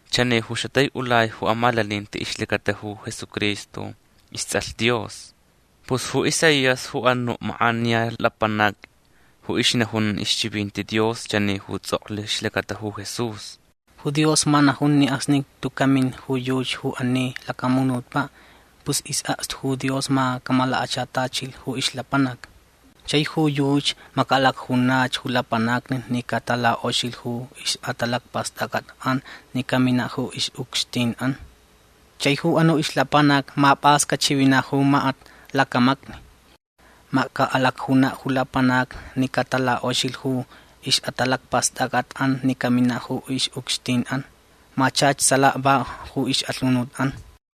Chani ju xatai'ulai ju amalaninti ixlacata ju Jesucristo ists'alh Dios. Pus ju Isaías ju anu' mak'aniya lapanac ju ixnajun ixchivinti Dios chani ju ts'oklh ixlacata ju Jesús: Ju Dios ma najun ni acsni tuca' min ju yuchi ju ani lacamunutpa' pus is'akstu ju Dios ma camalakachatachilh ju ixlapanac. Chai ju yuchi ma ca'alacjunach ju lapanacni ni catalak'oxilh ju ix'atalacpast'ac'at'an ni camina' ju ix'ucxtin'an. Chai ju anu' ixlapanac ma p'as cachivina' ju makat lacamacni. Ma ca'alacjuna' ju lapanacni ni catalak'oxilh ju ix'atalacpast'ac'at'an ni camina' ju ix'ucxtin'an. Ma chach salaka va ju ix'alhunut'an.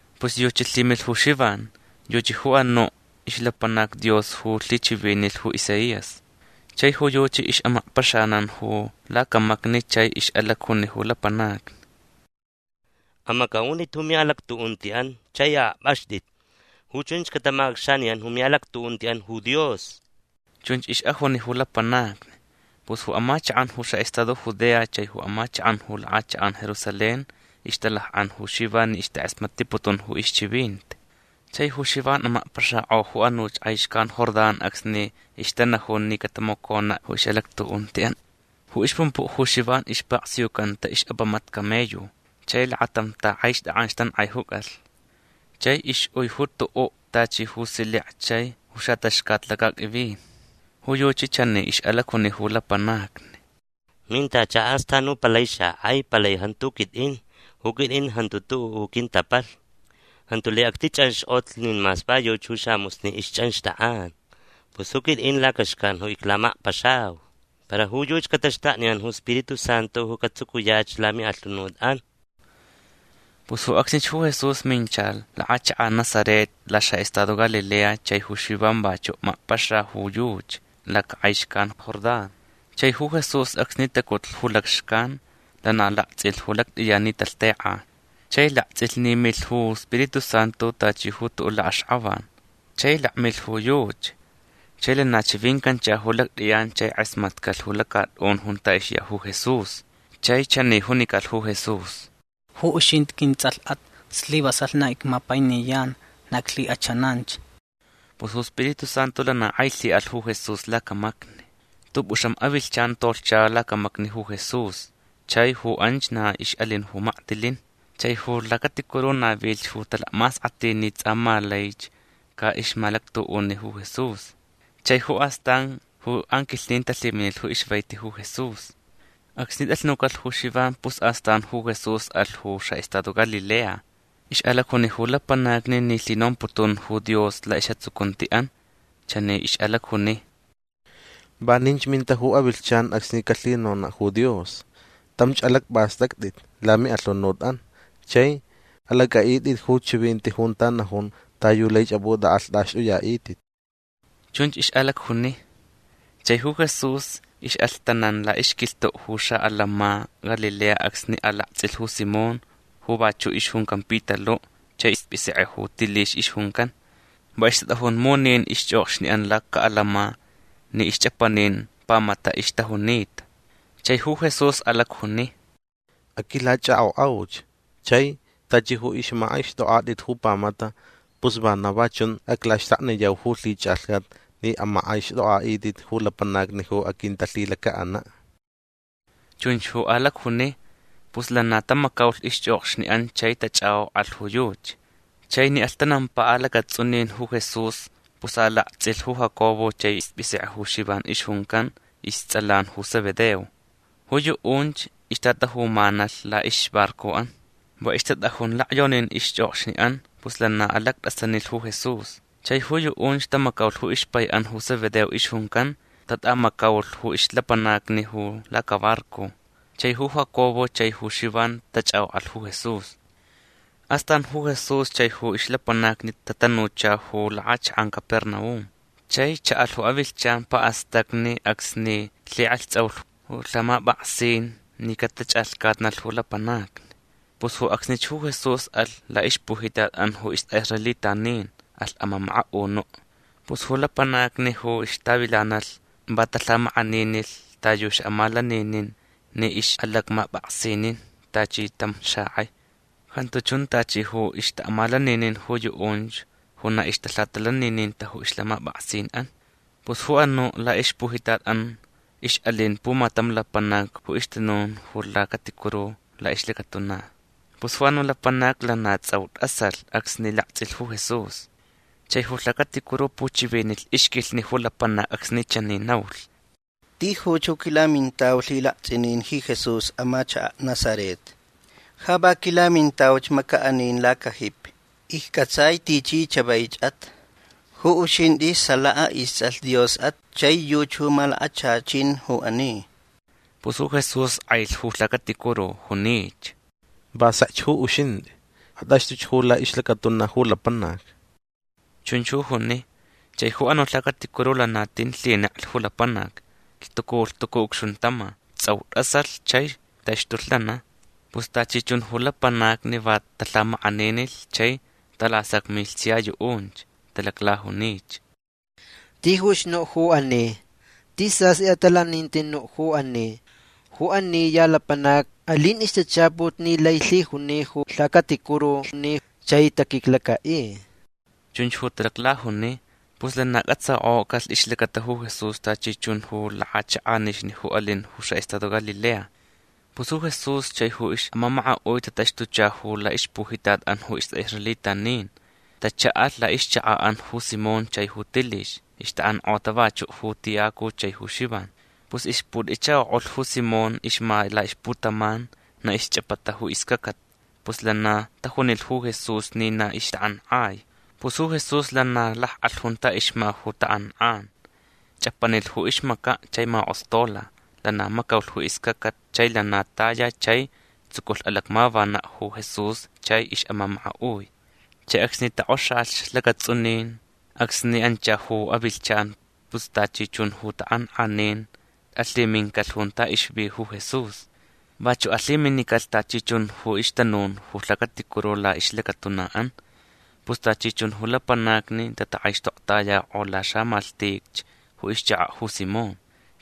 Pus yuchi lhimilh ju Xivan. Yuchi ju anu' ixlapanac Dios ju lhichivinilh ju Isaías. Chai ju yuchi ix'amakpaxanan ju lacamacni chai ix'alacjuni ju lapanacni: ―Amac'a'unt'it ju mi'alactu'unti'an chai a'akp'axt'it. Ju chunch catamac'acxaniyan ju mi'alactu'unti'an ju Dios. ―Chunch ix'ajuni ju lapanacni. Pus ju amachak'an ju xa'estado Judea chai ju amachak'an ju lak'achak'an Jerusalén ixtalak'an ju Xivan ni ixtak'asmatniputun ju ixchivinti. Chai ju Xivan amakpaxak'o ju anuch k'ai xcan Jordán acsni ixtanajun ni catamacona' ju ix'alactu'unti'an. Ju ixpumpu' ju Xivan ispaksiucanta ix'apamat camello. Chai lakatam tak'aixt'ak'an ixtank'aijucalh. Chai ix'ui ju tu'u' tachi ju silek chai ju xat'axcat lacaq'uivin. Ju yuchi chani ix'alacjuni ju lapanacni: ―Mintacha astan ju palai xak'ai. Palai jantu ju quit'in. Ju quit'in jantu tu'u' ju quintapalhni. Jantu laich actich'anxk'otlh nin mas va yuchi ju samusni ixch'anxt'ak'an. Pus ju quit'in lacaxcan ju iclamakpaxau. Para ju yuchi cataxtakniyan ju Spiritu Santu ju catsucuyach lami'alhunut'an. Pus ju acsnich ju Jesús mincha lak'achak'an Nazaret laxa'estado Galilea chai ju Xivan vachu' makpaxa ju yuchi lacak'ai xcan Jordán. Chai ju Jesús acsni tacutlh ju lacxcan lana lakts'ilh ju lact'iyan ni talhtek'a. Chai lakts'ilh ni milh ju Spiritu Santu tachi ju tu'u' lak'axk'avan. Chai lakmilh ju yuchi. Chai lana chivincancha ju lact'iyan chai k'asmatcalh ju lacat'un junta ixya ju Jesús. Chai chani junicalh ju Jesús: ―Ju uxint'i quints'alh'at. Slivasalh na icmapainiyan. Na iclhik'achananch. Pus ju Spiritu Santu lana k'ai lhi'alh ju Jesús lacamacni. T'up'uxam avilhchan tolhcha lacamacni ju Jesús. Chai ju anch na ix'alin ju maktilin. Chai ju lhacaticuru navilh ju talacmask'atinti ni ts'a ma laich ca'ixmalactu'uni ju Jesús. Chai ju astan ju anquilhnin talhiminilh ju ixvaiti ju Jesús. Acsni t'alhnucalh ju Xivan pus astan ju Jesús alh ju xa'estado Galilea. Ix'alacjuni ju lapanacni ni lhinomputun ju Dios la'is'atsucunti'an. Chani ix'alacjuni: ―Vaninch minta ju avilhchan acsni calhinona' ju Dios. Tamch alacp'ast'act'it lami'alhunut'an chai alac'a'it'it ju chivinti junta najun ta yu laich ap'ut'ak'alht'axt'uya'it'it. ―Chunch ix'alacjuni. Chai ju Jesús ix'alhtanan la'ixquilhtu' ju xa'atants'in Galilea acsni alakts'ilh ju Simón ju vachu' ixjuncan Pitalu' chai isp'isek'e ju Tilix ixjuncan. Va ixtat'ajun munin ixch'okxni'an laca'atants'in ni ixch'apanin pamata ixtajunita. Chai ju Jesús alacjuni: ―Aquilach'ak'ok'auch. Chai tachi ju ixmak'aixt'ok'at'it ju pamata pus vana va chun aclaxtakniyau ju lhich'alhcat ni amak'aixt'ok'a'it'it ju lapanacni ju aquintalhilaca'ana'. ―Chunch ju alacjuni. Pus lana tamacaulh ixch'okxni'an chai tach'ak'ok'alh ju yuchi. Chai ni alhtanampa alacats'unin ju Jesús pus alakts'ilh ju Jacobo chai isp'isek'e ju Xivan ixjuncan. Ists'alan ju Zebedeo. Ju yu'unch ixtatajumanalh la'ixbarco'an. Va ixtat'ajun lacyonin ixch'okxni'an. Pus lana alact'asanilh ju Jesús. Chai ju yu'unch tamacaulh ju ixpai'an ju Zebedeo ixjuncan. Tat'amacaulh ju ixlapanacni ju lacabarco. Chai ju Jacobo chai ju Xivan tach'ak'ok'alh ju Jesús. Astan ju Jesús chai ju ixlapanacni tatanucha ju lak'achak'an Capernaum. Chai cha'alh ju avilhchan pa'astacni acsni lhik'alhts'aulh ju lhamap'aksin ni catach'alhcatnalh ju lapanacni. Pus ju acsnich ju Jesús alh la'ixpujitat'an ju ist'a'israelitanin. Alh amamaka'unu'. Pus ju lapanacni ju ixtavilanalh va talhamak'aninilh ta yu xa'amalaninin ni ix'alacmap'aksinin tachi tam xak'ai. Jantu chun tachi ju ixta'amalaninin ju yu'unch ju na ixtalhatalanininta ju ixlhamap'aksin'an. Pus ju anu' la'ixpujitat'an ix'alin pumatam lapanac ju ixtanun ju lhacaticuru la'ixlacatuna. Pus ju anu' lapanac lana ts'au t'asalh acsni lakts'ilh ju Jesús. Chai ju lhacaticuru puchivinilh ixquilhni ju lapanac acsni chani naulh: ―Tijuch ju quilamintau lhilakts'inin ji Jesús amachaka' Nazaret. Ja va quilamintauch maca'anin lacajipi. Icc'atsai tichi chavaich'at. Ju uxint'i salaka ists'alh Dios'at chai yuchi ju malakachachan ju ani. Pus ju Jesús k'ailh ju lhacaticuru. Junich: ―Va sekch ju uxint'i. At'axt'uch ju la'ixlacatuna ju lapanac. ―Chunch ju juni. Chai ju anu' lhacaticuru lana tin lhineklh ju lapanac. Lhtucu lhtucu ucxuntama. Ts'au t'asalh chai taxtulh lana. Pus tachi chun ju lapanacni va talhamak'aninilh chai talasacmilh sia yu'unch. Talaclajunich: ―Tijuch nu' ju ani. Tis sast'i atalaninti nu' ju ani. Ju ani ya lapanac alin ixtachaput ni lai lhijuni ju lhacaticurulhni chai taquiclaca'i. ―Chunch ju talaclajuni. Pus lana c'atsak'ocalh ixlacata ju Jesús tachi chun ju lak'achak'anixni ju alin ju xa'estado Galilea. Pus ju Jesús chai ju ix'amamaka'ui tataxtucha ju la'ixpujitat'an ju ist'a'israelitanin. Tacha'alh la'ixchaka'an ju Simón chai Tilix. Ixta'ank'ota vachu' ju Tiyacu chai ju Xivan. Pus ixput'ichako'ulh ju Simón ixma la'ixputaman. Na ixch'apata ju iscacat. Pus lana tajunilh ju Jesús ni na ixtak'ank'ai. Pus ju Jesús lana lak'alh junta ixma ju tak'ank'an. Ch'apanilh ju ixmaca' chai mak'ostola. Lana macaulh ju iscacat chai lana taya chai tsuculh alacmavana' ju Jesús chai ix'amamaka'ui. Chai acsni tok'oxalhch lacats'unin acsni ancha ju avilhchan pus tachi chun ju tak'ank'anin alhimincalh junta ixvi ju Jesús. Vachu' alhiminicalh tachi chun ju ixtanun ju lhacaticuru la'ixlacatuna'an. Pus tachi chun ju lapanacni tatak'aixtoktayak'o laxamalhtich ju ixchaka' ju Simón.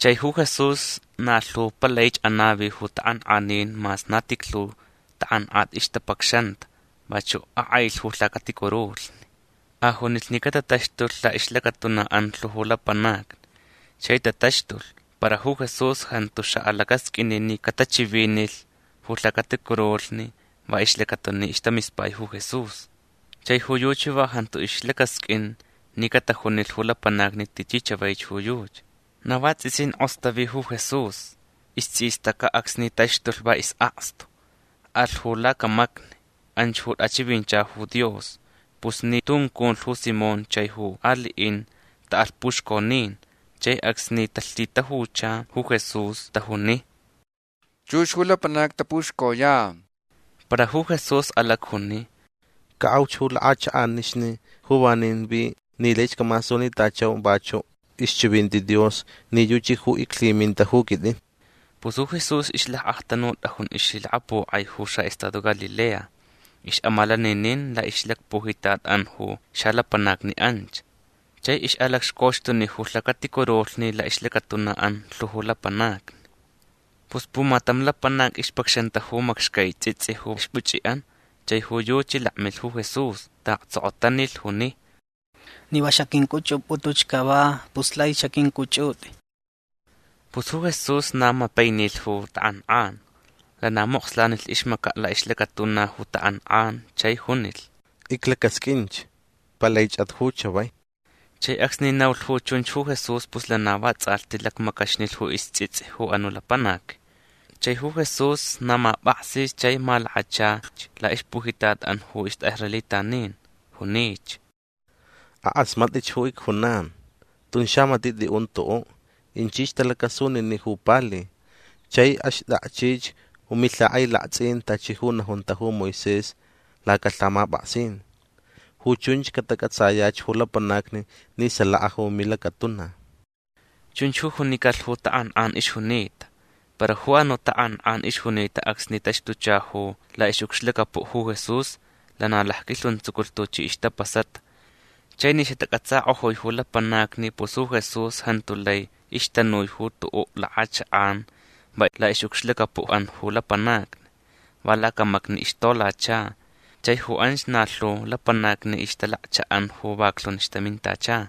Chai ju Jesús na lhu palaich anavi ju tak'ank'anin mas na tijlhu tak'ank'at ixtapacxanta. Vachu' ak'ailh ju lhacaticurulhni. Ajunilh ni catataxtulh la'ixlacatuna'an lhu ju lapanacni. Chai tataxtulh. Para ju Jesús jantu xa'alacasq'uini ni catachivinilh ju lhacaticurulhni va ixlacata ni istamispai ju Jesús. Chai ju yuchi va jantu ixlacasq'uin ni catajunilh ju lapanacni tichi chavaich ju yuchi. Na vats'isin k'ostavi ju Jesús. Ists'istaca' acsni taxtulh va is'akstu. Alh ju lacamacni. Anch ju t'achivincha ju Dios. Pus ni tunculh ju Simón chaich ju ali'in ta'alh puxconin. Chai acsni talhitajucha ju Jesús tajuni: ―Chux ju lapanacni tapuxcoyan. Para ju Jesús alacjuni: ―Ca'auch ju lak'achak'anixni ju vanin vi ni laich camasunitachau vachu' ixchivinti Dios ni yuchi ju iclhiminta ju quit'in. Pus ju Jesús ixlac'aktanut'ajun ixlhilakapok'ai ju xa'estado Galilea. Ix'amalaninin la'ixlacpujitat'an ju xalapanacni anch. Chai ix'alacxcoxtuni ju lhacaticurulhni la'ixlacatuna'an lhu ju lapanacni. Pus pumatam lapanac ixpacxanta ju macxcai ts'its'i ju ixpuch'i'an. Chai ju yuchi lakmilh ju Jesús. Ta'aktsokotanilh. Juni: ―Ni va xaq'uinc'uch'up'ut'uch cava pus laich xaq'uinc'uch'ut'i. Pus ju Jesús na mapainilh ju tak'ank'an. Lana mokslanilh ixmaca' la'ixlacatuna ju tak'ank'an chai junilh: ―Iclacasq'uinch. Palaich'at ju chavai. Chai acsni naulh ju chunch ju Jesús pus lana vats'alhti lacmacaxnilh ju ists'its'i ju anu' lapanac. Chai ju Jesús na map'aksi chai malakachalhch la'ixlacpujitat'an ju ist'a'israelitanin. Junich: ―Ak'asmat'ich ju icjunan. Tun xamati' t'i'un tu'u'. Inchich talacasunini' ju pali. Chai axt'akchich ju milhak'ailakts'in tachi ju najunta ju Moisés lacalhamap'aksin. Ju chunch catac'atsayach ju lapanacni ni salaka ju milacatuna. ―Chunch ju junicalh ju tak'ank'an ixjunita. Para ju anu' tak'ank'an ixjunita acsni taxtucha ju la'ix'ucxlacapu' ju Jesús lana lacquilhuntsuculh tuchi ixtapasata. Chai ni xatac'atsak'ojui ju lapanacni pus ju Jesús jantu lai ixtanui ju tu'u' lak'achak'an va la'ix'ucxlacapu'an ju lapanacni. Va lacamacni ixtolacha. Chai ju anch na lhu lapanacni ixtalakcha'an ju vaklhun ixtamintacha.